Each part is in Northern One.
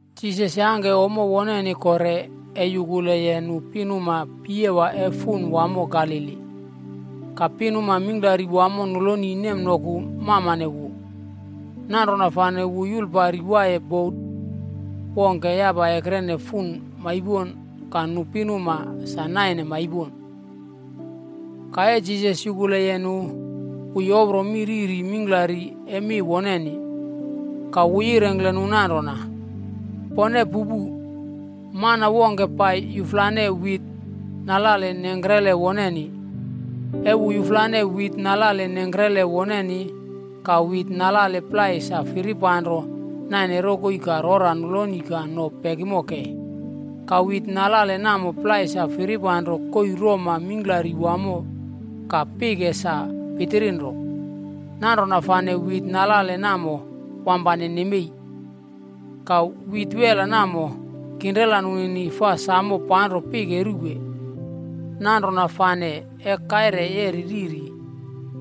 Jisas yangke ommo woneni kore e yukuleye nu pinuma piyewa e fun wamo Galili. Ka pinuma mingklari wamo noloni nemnoku mamane wu. Nanrona fane wu yulpari waiye bota wongke yapa ekrene fun maipon ka nu pinuma sa naine maipon. Ka e Jisas yukuleye nu, wu yopro mi riri mingklari e mi woneni. Ka wu yirengkle nu nanrona, “Pone pupu! Mana wongke pai yuflane wit nalale nengkrele woneni. E wu yuflane wit nalale nengkrele woneni, ka wit nalale plai sa firipanro naine rokoi ka rora noloni ka no pekimo kei. Ka wit nalale namo plai sa firipanro koii roma mingklari wamo ka pike sa pitirinro. Nanrona fane wit nalale namo wampane nemei. Ka wit wela namo, kinrela nunini fi samo panro pike ruwe. Nanrona fane e kaire yeri riri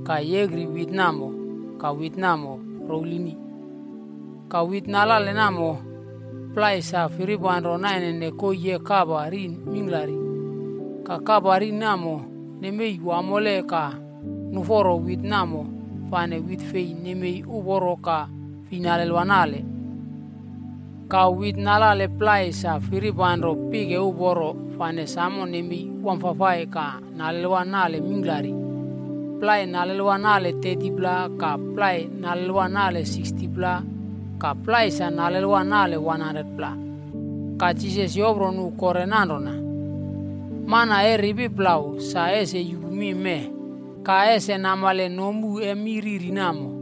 ka yekri wit namo ka wit namo rowlini. Ka wit nalale namo plai sa firipanro nainene koii e kapa rin mingklari. Ka kapa rin namo nemei wamole ka nuforo wit namo fane wit fei nemei uporo ka fi nalelwa nale. Ka wit nalale namo plai sa firipanro pike uporo fane samo nemei wamfafai ka nalelwa nalale mingklari. Plai nalelwa nale 30pla ka plai nalelwa nale 60pla ka plai sa nalelwa nale 100pla.” Ka Jisas yopro nu kore nanrona, “Mana e ripi plau sa ese yupu mi mee, ka ese namale nomu e mi riri namo.”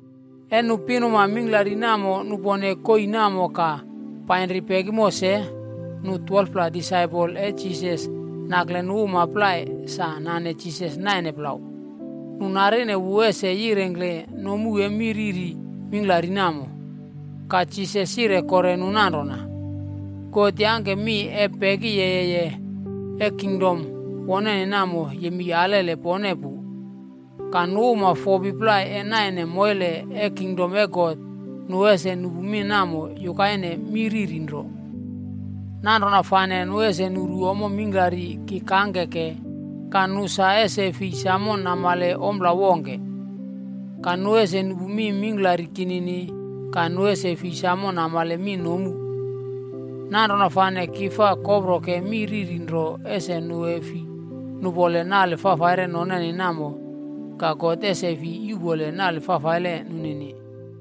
E nu pinuma mingklari namo nupone koii namo ka painri pekimo se, nu 12pla disaipol e Jisas nakle nu uma plai sa nane Jisas naine plau, nu narine wu ese yirengkle nomu e mi riri mingklari namo. Ka Jisas yire kore nu nanrona, “God yangke mi e pekiyeye e kingdom woneni namo yemei alele pone pu. Ka nu uma fopi plai e naine moile e kingdom e God, nu ese nupu mi namo yukaine mi riri nro. Nanrona fane ‘nu ese nuru ommo mingklari ki kangkeke, ka nu sa ese fi samo namale ompla wongke. Ka nu ese nupu mi mingklari kinini, ka nu ese fi samo namale mi nomu. Nanrona fane ki fa koproke mi riri nro ese nu e fi nupole nale fafaire noneni namo ka God ese fi yuꞌpole nale fafaile nunini.’”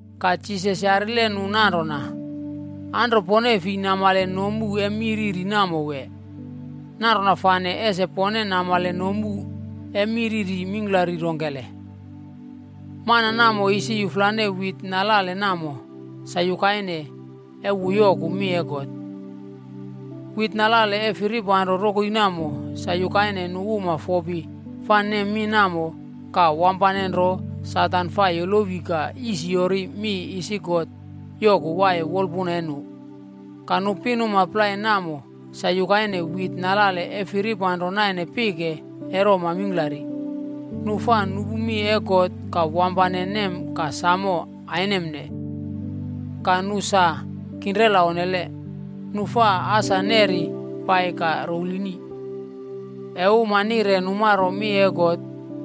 Ka Jisas yarile nu nanrona, “Anro pone fi namale nomu e mi riri namo wee? Nanrona fane ese pone namale nomu e mi riri mingklari rongkele? Mana namo isi yuflane wit nalale namo, sa yukaine e wu yoku mi e God. Wit nalale e firipanro rokoi namo, sa yukaine nu uma fopi fa nem mi namo, ka wampanenro Satan fa yolowi ka yisiyori mi isi God yoku waiye wolpuna e nu. Ka nu pinuma plai namo sa yukaine wit nalale e firipanro naine pike e roma mingklari. Nu fa nupu mi e God ka wampane nem ka samo ainemne. Ka nu sa kinrela onnele. Nu fa asa neri pai ka rowlini. E uma nire numaro mi e God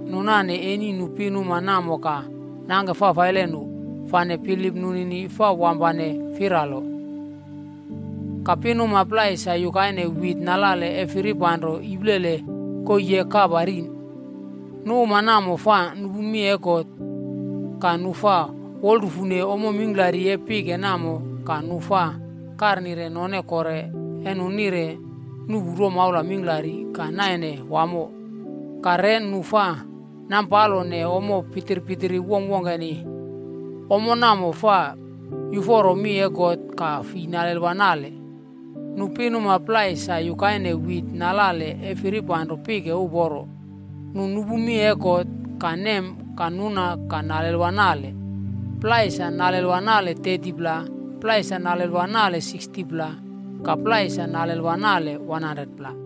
nu nane eni nu pinuma namo ka nangke fafaile nu, fane bilip nunini fa wampane firalo.” “Ka pinuma plai sa yukaine wit nalale e firipanro iplele koii e kapa rin. Nu uma namo fa nupu mi e God, ka nu fa wolrufune ommo mingklari e pike namo ka nu fa karnire none kore e nu nire nuꞌpu romaula mingklari ka naine wamo ka re nu fa nampalone ommo pitpitiri wongkwongkeni. Ommo namo fa yuforo mi e God ka fi nalelwa nale. Nu pinuma plai sa yukaine wit nalale e firipanro pike uporo. Nu nupu mi e God, ka nem ka nuna ka nalelwa nale. Plai sa nalelwa nale 30pla, plai sa nalelwa nale 60pla ka plai sa nalelwa nale 100pla.”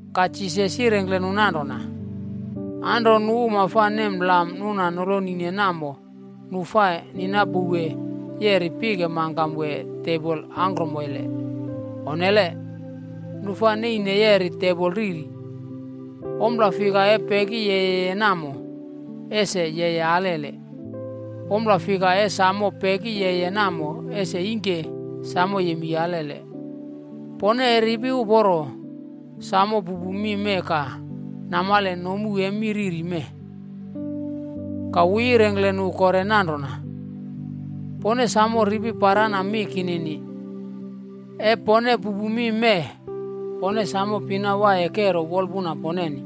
Ka Jisas yirengkle nu nanrona, “Anro nu uma fa nem lam nuna nolonine namo nu fa ninapouwe yeri pike mangkam wee tebol angkromoile? Onnele. Nu fa neine yeri tebol riri. Ompla fika e peki yeye namo, ese yeye alele. Ompla fika e samo peki yeye namo ese ingke samo yemei alele. Pone e ripi uporo, samo pupu mi mee ka namale nomu e mi riri mee.” Ka wu yirengkle nu kore nanrona, “Pone samo ripi parana mi kinini. E pone pupu mi mee, pone sam pina waiye kero wolpuna poneni.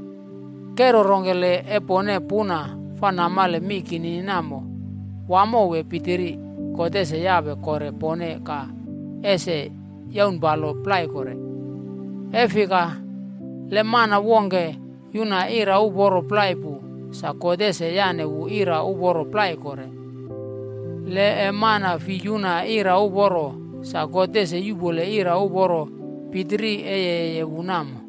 Kero rongkele e pone puna fa namale mi kinini namo, wamo wee pitiri, God ese yape kore pone ka ese yaunpalo plai kore. E fika, le mana wongke yuna ira uporo plai pu, sa God ese yane wu ira uporo plai kore. Le e mana fi yuna ira uporo, sa God ese yupole ira uporo pitiri e yeye wu namo.”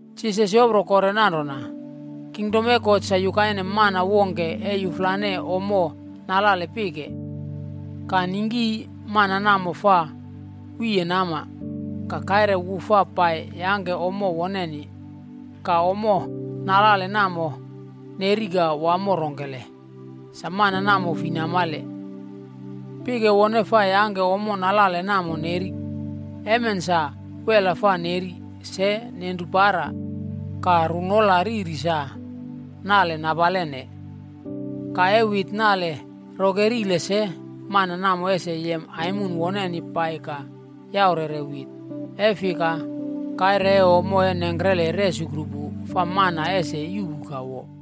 Jisas yopro kore nanrona, “Kingdom e God sa yukaine mana wongke e yuflane ommo nalale pike. Ka ningki mana namo fa wiye nama, ka kaire wu fa pai yangke ommo woneni. Ka ommo nalale namo neri ka wamo rongkele, sa mana namo fi namale. Pike wone fa yangke ommo nalale namo neri. Emen sa, wela fa neri, se nenru para, ka runola riri sa nale napalene. Ka e wit nale rokerile se, mana namo ese yem aimon woneni pai ka yaurere wit. E fika, kaire e ommo e nengkrele resukru pu fa mana ese yuꞌpu ka wo.”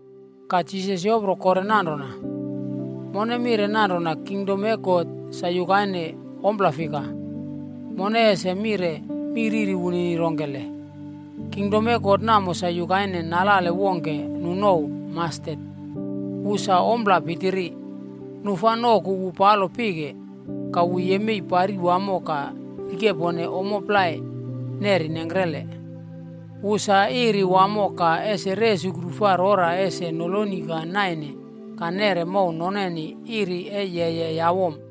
Ka Jisas yopro kore nanrona, “Mone mire nanrona kingdom e God sa yukaine ompla fika? Mone ese mire mi riri wunini rongkele? Kingdom e God namo sa yukaine nalale wongke nu nouw ‘mastet’. Wu sa ompla pitiri. Nu fa noku wu palo pike, ka wu yemei pari wamo ka rikepone ommo plai neri nengkre. Wu sa iri wamo ka ese resukru fa rora ese noloni ka naine ka nere mow noneni iri e yeye yawom.”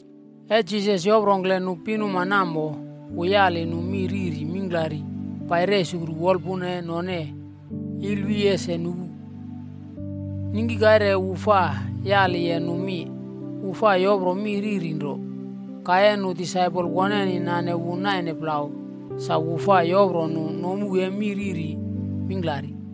E Jisas yoprongkle nu pinuma namo, wu yali nu mi riri mingklari pai resukru wolpuna e none ilwi ese nupu. Ningki kaire wu fa yaliye nu mi, wu fa yopro mi riri nro. Ka e nu disaipol woneni nane wu naine plau, sa wu fa yopro nu nomu e mi riri mingklari.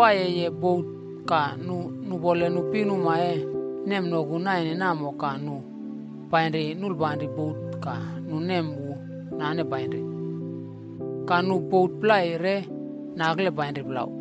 Jisas sa nawaiyeye bot ka nu nupole nu pinuma e nemnoku naine namo ka nu painri nulipanri bot ka nu nem wu nane painri. Ka nu bot plai re nakle painri plau.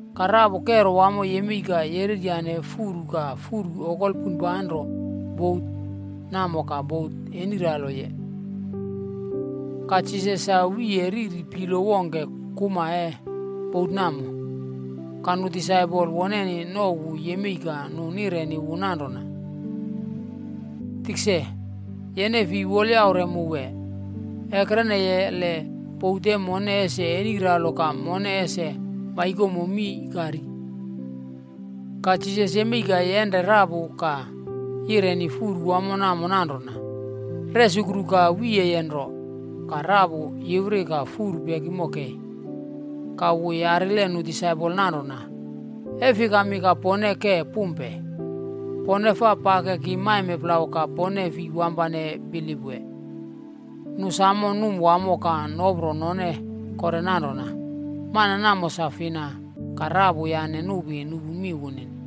Ka rapu kero wamo yemei ka yereryane furu ka furu okol poinpanro bot namo ka bot eniraloye. Ka Jisas sa wiye riri pilo wongke kuma e bot namo. Ka nu disaipol woneni nouw wu yemei ka nu nireni wu nanrona, “Tikse, yene fi wolyaure mu wee? Ekreneye le bot e mone ese eniralo ka mone ese maikomo mii ka ri.” Ka Jisas yemei ka yenre rapu ka yireni furu wamo namo nanrona, “Resukru ka wiyeye nro!” Ka rapu yiwri ka furu pekimo kei. Ka wu yarile nu disaipol nanrona, “E fikami ka pone ke pumpe? Pone fa pakeki maime plau ka pone fi wampane bilip wee?” Nu samo num wamo ka nopro none kore nanrona, “Mana namo sa fina, ka rapu yane nupi nupu mi wunini?”